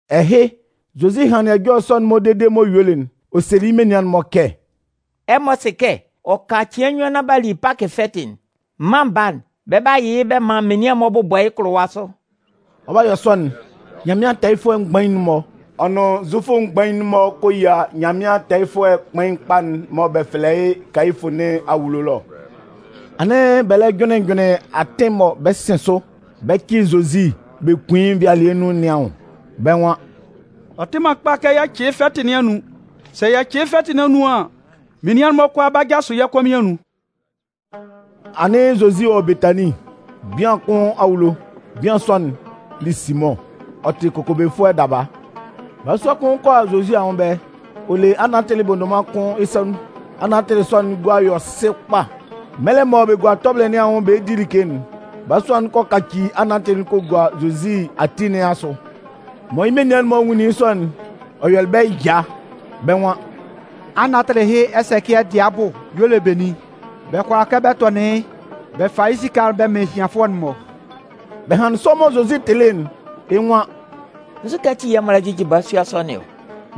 Ɛhɩ, Zozi hanlɩn ɛjɔlɛ sɔ'n-mɔ dede m'ɔ yuelɩ'n, ɔ selɩ yɩ́ menian'n-mɔ kɛ: Ɛmɔ sɩ kɛ ɔ ka cɩan nnyuan nán b'a li Pakɩ fɛtɩ'n. Mân Baa'n, bɛ 'ba yɩ yɩ́ bɛ man menian'n-mɔ bʋbɔ yɩ́ kʋlʋwa sʋ. Ɔ 'ba yɔ sɔ'n, Nyanmɩan tɛɛyɩfʋɛ mgbain'n-mɔ, ɔ nʋn Zufʋ mgbain'n-mɔ kɔ yia Nyanmɩan tɛɛyɩfʋɛ kpain kpa'n mɔ bɛ fɛlɛ yɩ́ Kayifʋ nɩn awulo ɛlɔ. Anɩn bɛ lɛ jʋnlɩn jʋnlɩn atɩn mɔ bɛ 'sɩn sʋ bɛ cɩ Zozi bɛ kun yɩ́ nvɩalɩɛ nun nɩn anwʋn. Bɛ́ nwan: “Ɔ tɩ man kpa kɛ yɛ cɩ yɩ́ fɛtɩ nɩn anun. Sɛ yɛ cɩ yɩ́ fɛtɩ nɩn anun an, menian'n-mɔ kʋalaa 'ba jasʋ yɛ́ kɔmɩn anun.” Anɩn Zozi wɔ Betanin, bian kʋn awulo. Bian sɔ'n li Simʋn, ɔ tɩ kokobefʋɛ daba. Balasua kʋn kɔ a Zozi anwʋn ɛbɛlɛ, ɔ le anantɩlɩ bondoman kʋn yɩ́ sa nun. Anantɩlɩ sɔ'n gua yɔ sɩ kpa. Mɛlɛ mɔ bɛ gua tɔbɩlɩ nɩn anwʋn bɛ 'di like'n, balasua'n kɔ kaci anatɩlɩ'n kɔ gua Zozi ati nɩn asʋ. Mɔ yɩ́ menian'n-mɔ nwunlin yɩ́ sɔ'n, ɔ yɔlɩ bɛ́ ɛya, bɛ́ nwan: “Anatɩlɩ ɛhɩ ɛsɛcɩɛ dɩɛ abʋ y'ɔ le benin? Bɛ kʋala kɛ bɛ tɔnɩn yɩ́, bɛ fa yɩ́ esika'n bɛ man ehianfʋɛ'n-mɔ.” Bɛ hanlɩn sɔ mɔ Zozi tɩlɩ'n, yɩ́ nwan: “Nzukɛ ati yɛ̂ ɛmɔ lɛ jɩjɩ balasua sɔ nɩn ɔ?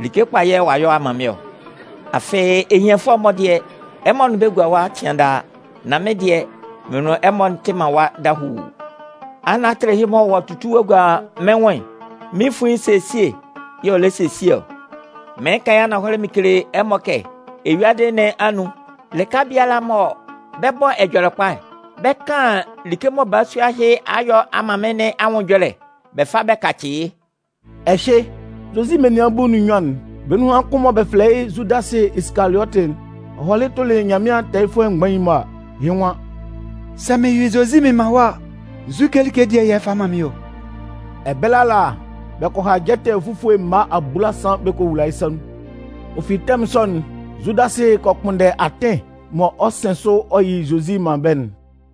Like kpa yɛ̂ ɔ'a yɔ ɔ'a man mɩ́n ɔ. Afɩ ehianfʋɛ'n-mɔ dɩɛ, ɛmɔ nʋn bɛ́ gua ɛwa cɩan daa. Nan mɩ́n dɩɛ, mɩn nʋn ɛmɔ tɩ man ɛwa dahuu. Anatɩlɩ ɛhɩ mɔ ɔ'a tutu ɔ'a gua mɩ́n nwʋn'n, mɩ́n fuin nɩn esesie y'ɔ lɛ sesie ɔ. Mɩɩn kan yɩ́ ananhɔlɛ mɩn kele ɛmɔ kɛ eyuadɩ nɩn anun lɩka biala mɔ bɛ 'bɔ Ɛjɔlɛkpa'n, bɛ 'kan like mɔ balasua ɛhɩ a yɔ a man mɩ́n nɩn anwʋn ɛjɔlɛ bɛ fa bɛ kacɩ yɩ́.” Ɛhɩ, Zozi menian bulu nʋn nnyuan'n, bɛ́ nunhan kʋn'n mɔ bɛ fɛlɛ yɩ́ Zudasɩ Isikaliɔtɩ'n, ɔ hɔlɩ tʋlɩ Nyanmɩan tɛɛyɩfʋɛ mgbain'n-mɔ a, yɩ́ nwan: “Sɛ mɩn yɩ Zozi mɩn man ɛmɔ a, nzu like dɩɛ yɛ̂ ɛmɔ 'fa man mɩ́n ɔ?” Ɛbɛlɛ ala, bɛ kɔ ha jɛtɛ fufue mma abulasan bɛ kɔ wula yɩ́ sa nun. Ɔ fi tɛmʋn sɔ'n, Zudasɩ kɔ kpʋnndɛ atɩn mɔ ɔ 'sɩn sʋ ɔ yɩ Zozi man bɛ́'n.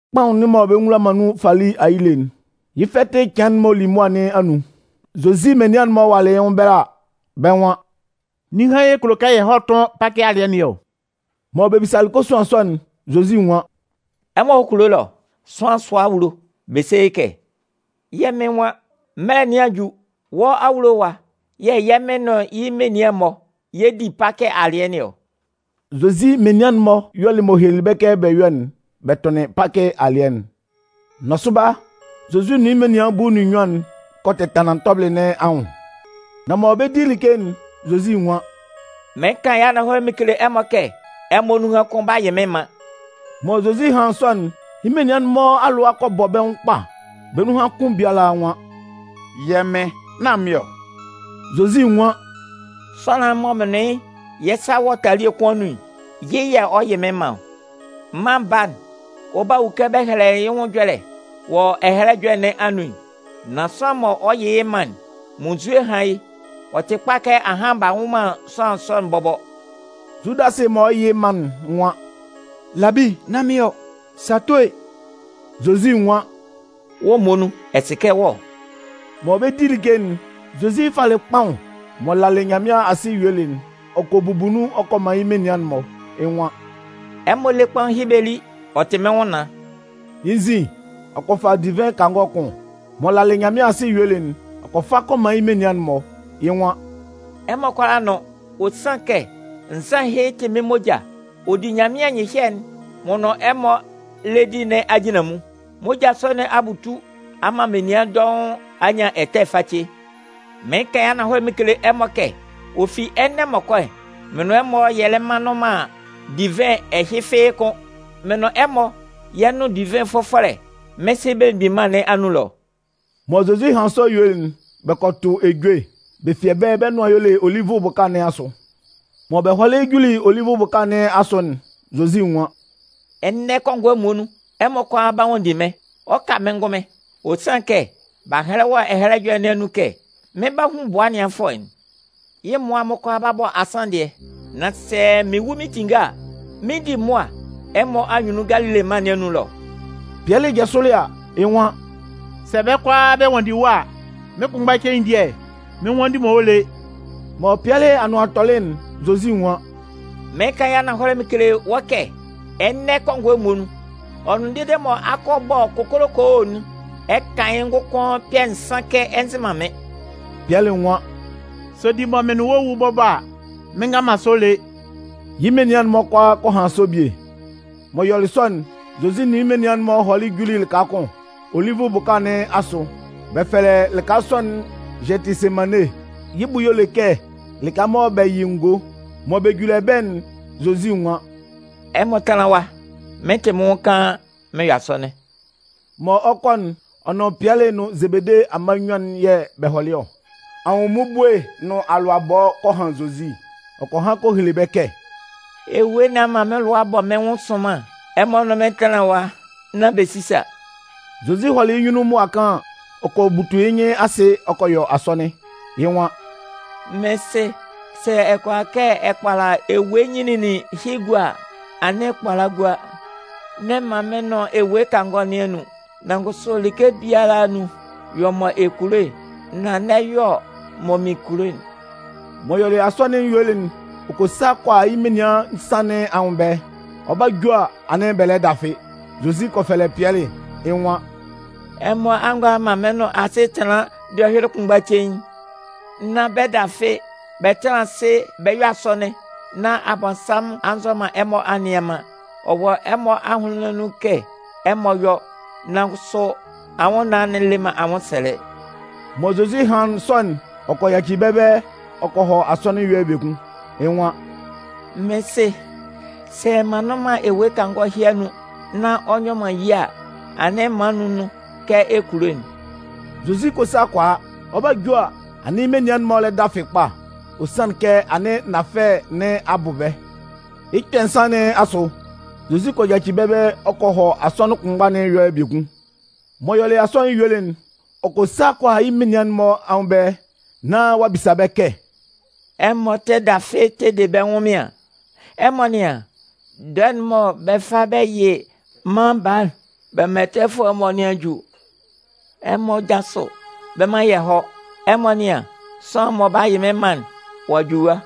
Kpaʋn'n mɔ bɛ nwula man nun fali ayile'n, yɩ́ fɛtɩ cɩan'n m'ɔ li mʋa nɩn anun, Zozi menian'n-mɔ walɩ yɩ́ nwʋn ɛbɛlɛ a, bɛ́ nwan: “Ninhan yɛ̂ ɛ kulo kɛ yɛ hɔ́ tʋ́n Pakɩ alɩɛ nɩn ɔ?” Mɔ bɛ bisalɩ kosuan sɔ'n, Zozi nwan: “Ɛmɔ hɔ́ kulo ɛlɔ, sʋanlan sʋa awulo, bɛ se yɩ́ kɛ: ‘Yɛ́ Mɩn nwan: Mɩ́n mɛlɛ nɩn a ju, wɔ́ awulo ɛwa yɛ̂ mɩn nʋn mɩ́n menian'n-mɔ yɛ 'di Pakɩ alɩɛ nɩn ɔ.’” Zozi menian'n-mɔ yɔlɩ m'ɔ helelɩ bɛ́ kɛ bɛ yɔ́'n bɛ tʋnlɩn Pakɩ alɩɛ'n. Nɔsʋba, Zozi nʋn yɩ́ menian bulu nʋn nnyuan'n kɔ tɛtanlan tɔbɩlɩ nɩn anwʋn. Nán mɔ bɛ 'di like'n, Zozi nwan: “Mɩɩn kan yɩ́ ananhɔlɛ mɩn kele ɛmɔ kɛ, ɛmɔ nunhan kʋn 'ba yɩ mɩ́n man.” Mɔ Zozi hanlɩn sɔ'n, yɩ́ menian'n-mɔ alʋa kɔ bɔ bɛ́ nwʋn kpa. Bɛ́ nun kʋn biala nwan: “Yɛ́ Mɩn, nán mɩ́n ɔ.” Zozi nwan: “Sʋanlan'n m'ɔ nʋn mɩ́n yɛ́ sa wɔ talie nɩn anun'n, yɩ́ yɛ̂ ɔ 'yɩ mɩ́n man ɔ. Mân Baa'n, ɔ 'ba wu kɛ bɛ hɛlɛlɩ yɩ́ nwʋn ɛjɔlɛ'n wɔ Ɛhɛlɛ Ɛjɔlɛ'n nɩn anun'n. Nan sʋanlan'n mɔ ɔ 'yɩ yɩ́ man'n, munnzue hán yɩ́! Ɔ tɩ kpa kɛ ahan b'a nwʋ man sʋanlan sɔ'n bɔbɔ.” Zudasɩ mɔ ɔ 'yɩ yɩ́ man'n nwan: “Labi, nán mɩ́n ɔ. Sɛ ato e.” Zozi nwan: “Wɔ́ muonun, ɛ sɩ kɛ wɔ́ ɔ.” Mɔ bɛ 'di like'n, Zozi kɔ fa kpaʋn, m'ɔ lalɩ Nyanmɩan asɩ yuelɩ'n, ɔ kɔ bubu nun ɔ kɔ man yɩ́ menian'n-mɔ. Yɩ́ nwan: “Ɛmɔ lé kpaʋn ɛhɩ bɛ lí, ɔ tɩ mɩ́n nwʋnnaan.” Yɩ́ nzin, ɔ kɔ fa divɩn kangɔ kʋn, m'ɔ lalɩ Nyanmɩan asɩ yuelɩ'n, ɔ kɔ fa ɔ kɔ man yɩ́ menian'n-mɔ. Yɩ́ nwan: “Ɛmɔ kʋalaa nʋ́n. Ɔ sanlɩn kɛ nzan ɛhɩ tɩ mɩ́n moja ɔ di Nyanmɩan nyɩhyɛ'n m'ɔ nʋn ɛmɔ lɛ di nɩn ajinlanmun. Moja sɔ nɩn a butu a man menian dɔʋn a nyan ɛtɛ face. Mɩɩn kan mɩn kele ɛmɔ kɛ ɔ fi ɛnɛ m'ɔ kɔ'n, mɩn nʋn ɛmɔ yɛ lɛ mma nnʋn man divɩn ɛhɩ fɩ́ɩ́ kʋ́n. Mɩn nʋn ɛmɔ yɛ 'nʋn divɩn fʋfɔlɛ'n mɩ́n Sɩ Belemgbin Mân nɩn anun ɛlɔ.” Mɔ Zozi hanlɩn sɔ yuelɩ'n, bɛ kɔ tʋ ejue. Bɛ fi ɛbɛlɛ bɛ́ nʋan y'ɔ le Olivʋ bʋka nɩn asʋ. Mɔ bɛ hɔlɩ juli Olivʋ bʋka nɩn asʋ ɛlɔ'n, Zozi nwan: “Ɛnɛ kɔngɔɛ muonun, ɛmɔ kʋalaa 'ba nwanndi mɩ́n, ɔ ka mɩ́n ngʋnmɩn. Ɔ sanlɩn kɛ, b'a hɛlɛ wɔ Ɛhɛlɛ Ɛjɔlɛ nɩn anun kɛ: Mɩn 'ba hun bʋa ɛnɩanfʋɛ'n. Yɩ́ mmʋa'n-mɔ kʋalaa 'ba bɔ asanndɩɛ. Nan sɛ mɩn wu mɩn tinnge a, mɩn 'di mʋa ɛmɔ anyunnun Galile mân nɩn anun ɛlɔ.” Pɩɛlɩ jasʋlɩ a, yɩ́ nwan: “Sɛ bɛ́ kʋalaa bɛ nwanndi wɔ́ a, mɩ́n kʋnmgba cein dɩɛ mɩn nnwanndi man wɔ́ lé.” Mɔ Pɩɛlɩ anʋan tɔlɩ'n, Zozi nwan: “Mɩɩn kan yɩ́ ananhɔlɛ mɩn kele wɔ́ kɛ ɛnɛ kɔngɔɛ muonun, ɔ nʋn dee mɔ akɔ'n 'bɔ kokolokoo'n, ɛ 'kan yɩ́ ngʋkʋn kpɛ̂ nsan kɛ ɛ nzɩ man mɩ́n.” Pɩɛlɩ nwan: “Sɛ ɔ di mɔ mɩn nʋn wɔ́ wu bɔbɔ a, mɩn ngan man sɔ lé.” Yɩ́ menian'n-mɔ kʋalaa kɔ han sɔ bie. M'ɔ yɔlɩ sɔ'n, Zozi nʋn yɩ́ menian'n-mɔ hɔlɩ juli lɩka kʋn Olivʋ bʋka nɩn asʋ. Bɛ fɛlɛ lɩka sɔ'n Gɛtɩsemanne (yɩ́ bʋ y'ɔ le kɛ lɩka mɔ bɛ yɩ ngo). Mɔ bɛ juli ɛbɛlɛ'n, Zozi nwan: “Ɛmɔ tánlan ɛwa nán mɩn 'tɩ mɩ́n nwʋn kaan mɩn yɔ asɔnɩn.” Mɔ ɔ 'kɔ'n, ɔ nʋn Pɩɛlɩ nʋn Zebede amma nnyuan'n yɛ̂ bɛ hɔlɩ ɔ. Anwʋnmmubue nʋn alʋabɔ kɔ han Zozi. Ɔ kɔ han kɔ hele bɛ́ kɛ: “Ewue nɩn a man mɩ́n lʋa a bɔ mɩ́n nwʋn sʋnman. Ɛmɔ nʋn mɩ́n tánlan ɛwa, nán bɛ sísa!” Zozi hɔlɩ yɩ́ nyunnun mʋa kaan an, ɔ kɔ butu yɩ́ nyɩn asɩ ɔ kɔ yɔ asɔnɩn. Yɩ́ nwan: “Mɩ́n Sɩ, sɛ ɛ kʋala kɛ ɛ kpala ewue nyinlinlin ɛhɩ gua a, anɩn kpala gua! N'ɛ man mɩn nʋn ewue kangɔ nɩn anun. Nan kʋsʋ like biala anun, yɔ mɔ ɛ kulo'n nan n'ɛ yɔ mɔ mɩn kulo'n.” M'ɔ yɔlɩ asɔnɩn'n yuelɩ'n, ɔ kɔ sa kɔ a yɩ́ menian nsan'n-mɔ anwʋn ɛbɛlɛ. Ɔ 'ba ju a, anɩn bɛ lɛ dafɩ. Zozi kɔ fɛlɛ Pɩɛlɩ, yɩ́ nwan: “Ɛmɔ a ngʋala man mɩ́n nʋn asɩ tanlan dɔhyʋɩlɩ kʋnmgba cein? Nán bɛ dafɩ, bɛ tánlan asɩ bɛ yɔ́ asɔnɩn, nán Abɔnsanmʋn a nzɔ man ɛmɔ a nnɩan man. Ɔ wɔ ɛmɔ ahʋnlɩn nɩn anun kɛ ɛmɔ 'yɔ, nan kʋsʋ anwʋnnaan'n le man anwʋnsɛlɛ.” Mɔ Zozi hanlɩn sɔ'n, ɔ kɔ yaci bɛ́ ɛbɛlɛ ɔ kɔ hɔ asɔnɩn ɛyɔlɛ biekun. Yɩ́ nwan: “Mɩ́n Sɩ, sɛ m'an nnʋn man ewue kangɔ ɛhɩ anun nán ɔ nyɔ man ye a, anɩn man n nʋ́n nun kɛ ɛ kulo'n.” Zozi kɔ sa kɔ a. Ɔ 'ba ju a, anɩn yɩ́ menian'n-mɔ lɛ dafɩ kpa. Ɔ sanlɩn kɛ anɩn nafɛlɛ nɩn a bʋ bɛ́. Yɩ́ kpɛ̂ nsan nɩn asʋ, Zozi kɔ yaci bɛ́ ɛbɛlɛ ɔ kɔ hɔ asɔnɩn kʋnmgba nɩn ɛyɔlɛ biekun. M'ɔ yɔlɩ asɔnɩn yuelɩ'n, ɔ kɔ sa kɔ a yɩ́ menian'n-mɔ anwʋn ɛbɛlɛ, nán ɔ'a bisa bɛ́ kɛ: “Ɛmɔ tɛ dafɩ bɛ tɛ de bɛ́ ɛnwʋnmɩan? Ɛmɔ nɩ́an, dɔɛ'n mɔ bɛ 'fa bɛ yɩ Mân Baa'n bɛ man ɛtɛfʋɛ'n-mɔ nɩn a ju. Ɛmɔ jásʋ bɛ mán yɛ hɔ́. Ɛmɔ nɩ́an, sʋanlan'n mɔ ɔ 'ba yɩ mɩ́n man'n, ɔ'a ju ɛwa.”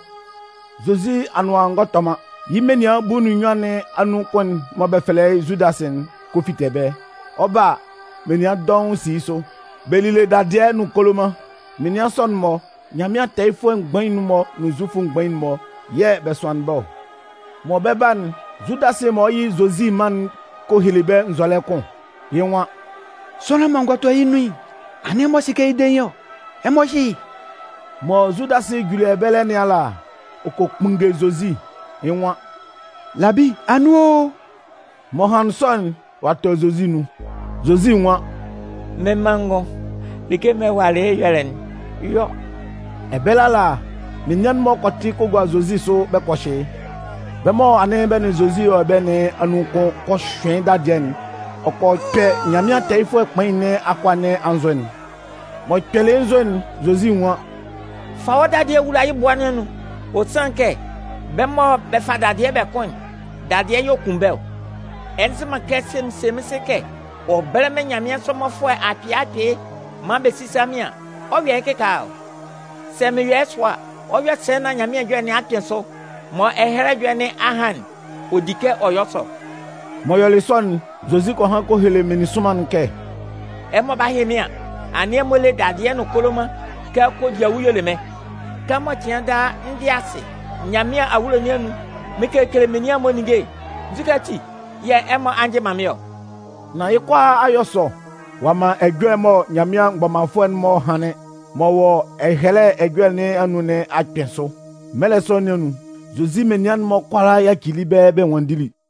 Zozi anʋan ngɔ tɔ man, yɩ́ menian bulu nʋn nnyuan nɩn anun kʋn'n mɔ bɛ fɛlɛ yɩ́ Zudasɩ'n kɔ fite ɛbɛlɛ. Ɔ 'ba a, menian dɔʋn si yɩ́ sʋ. Bɛ lile dadɩɛ nʋn koloman. Menian sɔ'n-mɔ, Nyanmɩan tɛɛyɩfʋɛ mgbain'n-mɔ nʋn Zufʋ mgbain'n-mɔ yɛ̂ bɛ sʋanlɩn bɛ́ ɔ. Mɔ bɛ 'ba'n, Zudasɩ mɔ ɔ 'yɩ Zozi man'n kɔ hele bɛ́ nzɔlɛ kʋn. Yɩ́ nwan: “Sʋanlan'n mɔ n gɔ tɔ yɩ́ nun'n, anɩn ɛmɔ sɩ kɛ yɩ́ dein ɔ. Ɛmɔ hyɩ́ yɩ́.” Mɔ Zudasɩ juli ɛbɛlɛ nɩn ala, ɔ kɔ kpunnge Zozi. Yɩ́ nwan: “Labi, anun o.” M'ɔ hanlɩn sɔ'n, ɔ'a tɔ Zozi nun. Zozi nwan: “Mɩ́n manngʋn, like mɔ ɛ walɩ yɩ́ ɛyɔlɛ'n, yɔ.” Ɛbɛlɛ ala, menian'n-mɔ kɔ tɩ kɔ gua Zozi sʋ bɛ kɔ hyɩ yɩ́. Bɛ́ mɔ anɩn bɛ nʋn Zozi wɔ ɛbɛlɛ nɩn anun kʋn kɔ hyʋɩn yɩ́ dadɩɛ'n, ɔ kɔ kpɛ Nyanmɩan tɛɛyɩfʋɛ kpain nɩn akʋa nɩn anzʋ'n. M'ɔ kpɛlɩ yɩ́ nzʋ'n, Zozi nwan: “Fa wɔ́ dadɩɛ'n wula yɩ́ bʋa nɩn anun. Ɔ sanlɩn kɛ bɛ́ mɔ bɛ fa dadɩɛ bɛ kʋn'n, dadɩɛ yɛ̂ ɔ 'kun bɛ́ ɔ. Ɛ nzɩ man kɛ sɛ mɩn se mɩ́n Sɩ kɛ ɔ bɛ́lɛ mɩ́n nyanmɩansʋ mmɔfʋɛ akpɩɩ akpɩɩ maan bɛ sísa mɩ́n an, ɔ 'yɔ yɩ́ kɩkaala ɔ? Sɛ mɩn yɔ yɩ́ sɔ a, ɔ 'yɔ sɛ nán Nyanmɩan Anʋan Ɛjɔlɛ nɩn a kpɩn sʋ? Mɔ Ɛhɛlɛ Ɛjɔlɛ nɩn a han'n, ɔ di kɛ ɔ yɔ sɔ.” M'ɔ yɔlɩ sɔ yuelɩ'n, Zozi kɔ han kɔ hele meninsʋnman'n kɛ: “Ɛmɔ 'ba hyɩ mɩ́n an, anɩn ɛmɔ le dadɩɛ nʋn koloman kɛ kodiawu y'ɔ le mɩ́n. Kɛmɔ cɩan daa n dɩ asɩ Nyanmɩan awulo nɩn anun mɩn kekele menian'n-mɔ ninnge'n, nzukɛ ati yɛ̂ ɛmɔ a njɩ man mɩ́n ɔ?” Nan yɩ́ kʋalaa a yɔ sɔ, ɔ'a man ɛjɔlɛ'n mɔ Nyanmɩan mgbɔmanfʋɛ'n-mɔ hanlɩn m'ɔ wɔ Ɛhɛlɛ Ɛjɔlɛ nɩn anun nɩn a kpɩn sʋ. Mɛlɛ sɔ nɩn anun, Zozi menian'n-mɔ kʋalaa yacili yɩ́ ɛbɛlɛ bɛ nwanndili.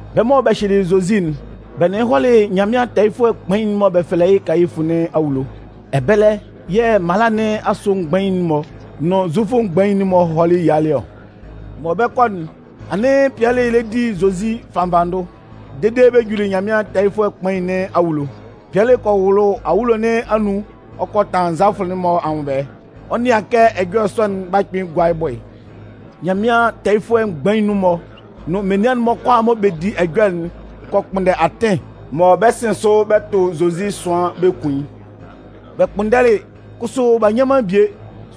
Bɛ́ mɔ bɛ hyɩlɩ Zozi'n, bɛ nʋn yɩ́ hɔlɩ Nyanmɩan tɛɛyɩfʋɛ kpain'n mɔ bɛ fɛlɛ yɩ́ Kayifʋ nɩn awulo. Ɛbɛlɛ yɛ̂ mala nɩn asʋ mgbain'n-mɔ nʋn Zufʋ mgbain'n-mɔ hɔlɩ yialɩ ɔ. Mɔ bɛ 'kɔ'n, anɩn Pɩɛlɩ lɛ di Zozi fannvanndʋ dede bɛ juli Nyanmɩan tɛɛyɩfʋɛ kpain nɩn awulo. Pɩɛlɩ kɔ wʋlʋ awulo nɩn anun, ɔ kɔ tanlan nzalafʋ'n-mɔ anwʋn ɛbɛlɛ, ɔ 'nɩan kɛ ɛjɔlɛ sɔ'n 'ba kpɩn gua yɩ́ bʋ'n. Nyanmɩan tɛɛyɩfʋɛ mgbain'n-mɔ nʋn menian'n-mɔ kʋalaa mɔ bɛ di ɛjɔlɛ'n kɔ kpʋnndɛ atɩn mɔ bɛ 'sɩn sʋ bɛ tʋn Zozi ɛsʋan bɛ kun yɩ́. Bɛ kpʋnndɛlɩ, kʋsʋ bɛ ngɔ nyan man bie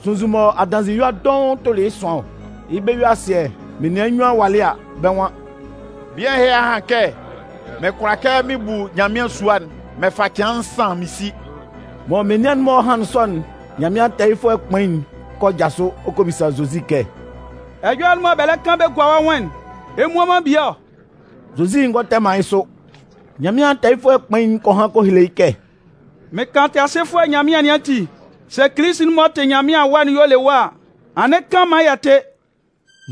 sunnzun mɔ adanzɩyua dɔʋn tʋnlɩn yɩ́ ɛsʋan ɔ. Yɩ́ bɛ-yue-asɩɛ, menian nnyuan walɩ a, bɛ́ nwan: “Bian ɛhɩ a han kɛ: ‘Mɩn kʋala kɛ mɩn bu Nyanmɩan sua'n mɩn fa cɩan nsan mɩn si.’” Mɔ menian'n-mɔ hanlɩn sɔ'n, Nyanmɩan tɛɛyɩfʋɛ kpain'n kɔ jasʋ, ɔ kɔ bisa Zozi kɛ: “Ɛjɔlɛ'n mɔ bɛ lɛ kan bɛ gua wɔ́ nwʋn'n, ɛ mmua man bie ɔ?” Zozi ngɔ tɛ man yɩ́ sʋ. Nyanmɩan tɛɛyɩfʋɛ kpain'n kɔ han kɔ hele yɩ́ kɛ: “Mɩn kan Tɩasɩfʋɛ Nyanmɩan nɩn ati, sɛ Kilisi'n m'ɔ tɩ Nyanmɩan Awa'n y'ɔ le wɔ́ a, anɩn kan maan yɛ tɩ́!”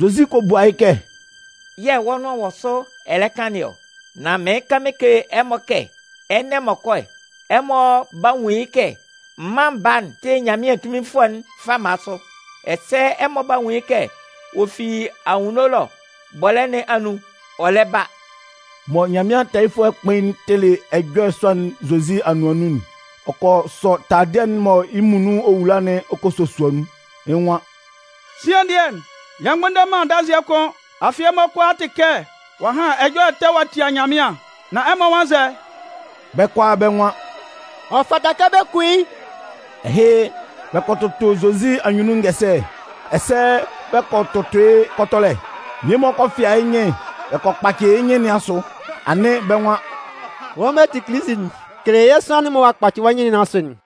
Zozi kɔ bua yɩ́ kɛ: “Yɛ̂ wɔ́ nʋan wɔ sʋ ɛ lɛ kan nɩn ɔ. Nan mɩɩn kan mɩn kele ɛmɔ kɛ ɛnɛ m'ɔ kɔ'n, ɛmɔ 'ba nwun yɩ́ kɛ Mân Baa'n tɩ Nyanmɩan tunminfʋɛ'n fama sʋ. Ɛsɛ ɛmɔ 'ba nwun yɩ́ kɛ ɔ fi anwunno ɛlɔ bɔlɛ́ nɩn anun ɔ lɛ ba.” Mɔ Nyanmɩan tɛɛyɩfʋɛ kpain'n tɩlɩ ɛjɔlɛ sɔ'n Zozi anʋan nun'n, ɔ kɔ sɔ taladɩɛ'n mɔ yɩ́ muonun ɔ wula'n ɔ kɔ sosua nun. Yɩ́ nwan: “Sian dɩɛ, yɛ mgbʋnndɛ man adanzɩɛ kʋ́n! Afɩ ɛmɔ kʋalaa a tɩ kɛ ɔ'a han ɛjɔlɛ ɛtɛ ɔ'a tia Nyanmɩan! Nan ɛmɔ nwan nzɛ?” Bɛ́ kʋalaa bɛ́ nwan: “Ɔ fata kɛ bɛ kun yɩ́.” Ɛhɩ, bɛ kɔ tʋtʋ Zozi anyunnun ngɛsɛlɛ, ɛsɛ bɛ kɔ tʋtʋ yɩ́ kɔtɔlɛ. Mmie-mɔ fɩa yɩ́ nyɩn bɛ kpaci yɩ́ nyɩn nɩn asʋ, anɩn bɛ́ nwan: “Wɔ́ mɔ ɛ tɩ Kilisi'n, kele yɛ́ sʋanlan'n mɔ ɔ'a kpaci wɔ́ nyɩn nɩn asʋ'n!”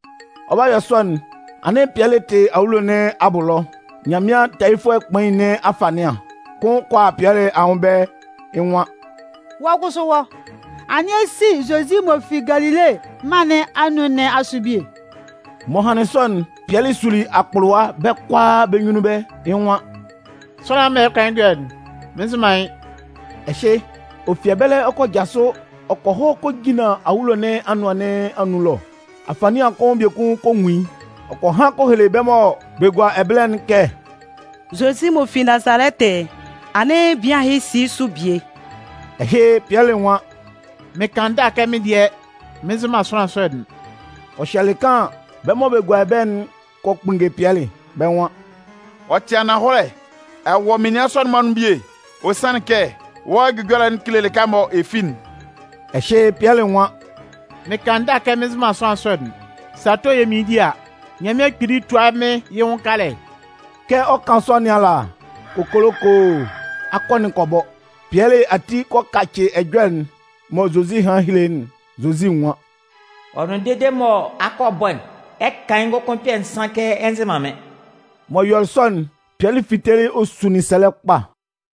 Ɔ 'ba yɔ sɔ'n, anɩn Pɩɛlɩ tɩ awulo nɩn abʋ ɛlɔ. Nyanmɩan tɛɛyɩfʋɛ kpain nɩn afanɩan kʋn kɔ a Pɩɛlɩ anwʋn ɛbɛlɛ, yɩ́ nwan: “Wɔ́ kʋsʋ wɔ́, anɩn ɛ si Zozi m'ɔ fi Galile mân nɩn anun nɩn asʋ bie.” M'ɔ hanlɩn sɔ'n, Pɩɛlɩ suli akpʋlʋwa bɛ́ kʋalaa bɛ́ nyunnun ɛbɛlɛ. Yɩ́ nwan: “Sʋanlan'n mɔ ɛ lɛ kan yɩ́ ɛjɔlɛ'n, mɩn nzɩ man yɩ́.” Ɛhɩ, ɔ fi ɛbɛlɛ ɔ kɔ jasʋ ɔ kɔ hɔ kɔ jinlan awulo nɩn anʋan nɩn anun ɛlɔ. Afanɩan kʋn biekun kɔ nwun yɩ́. Ɔ kɔ han kɔ hele bɛ́ mɔ bɛ gua ɛbɛlɛ'n kɛ: “Zozi m'ɔ fi Nazalɛtɩ'n, anɩn bian ɛhɩ si yɩ́ sʋ bie.” Ɛhɩ, Pɩɛlɩ nwan: “Mɩn kan ndâ kɛ mɩ́n dɩɛ, mɩn nzɩ man sʋanlan sɔ'n!” Ɔ hyɛlɩ kaan an, bɛ́ mɔ bɛ gua ɛbɛlɛ'n kɔ kpunnge Pɩɛlɩ, bɛ́ nwan: “Ɔ tɩ ananhɔlɛ, ɛ wɔ menian sɔ'n-mɔ anun bie. Ɔ sanlɩn kɛ wɔ́ ɛjʋjɔlɛ'n kele lɩka mɔ ɛ fi'n.” Ɛhɩ, Pɩɛlɩ nwan: “Mɩn kan ndâ kɛ mɩn nzɩ man sʋanlan sɔ'n! Sɛ ato yɛ̂ mɩɩn di a, Nyanmɩan Kpili túa mɩ́n yɩ́ nwʋn kalɛ!” Kɛ ɔ 'kan sɔ nɩn ala, kokolokoo! Akɔ'n kɔ bɔ. Pɩɛlɩ ati kɔ kacɩ ɛjɔlɛ'n mɔ Zozi hanlɩn helelɩ yɩ́'n. Zozi nwan: “Ɔ nʋn dede mɔ akɔ'n 'bɔ'n, ɛ 'kan yɩ́ ngʋkʋn kpɛ̂ nsan kɛ ɛ nzɩ man mɩ́n.” M'ɔ yɔlɩ sɔ'n, Pɩɛlɩ fitelɩ ɔ sunlin sɛlɛ kpa.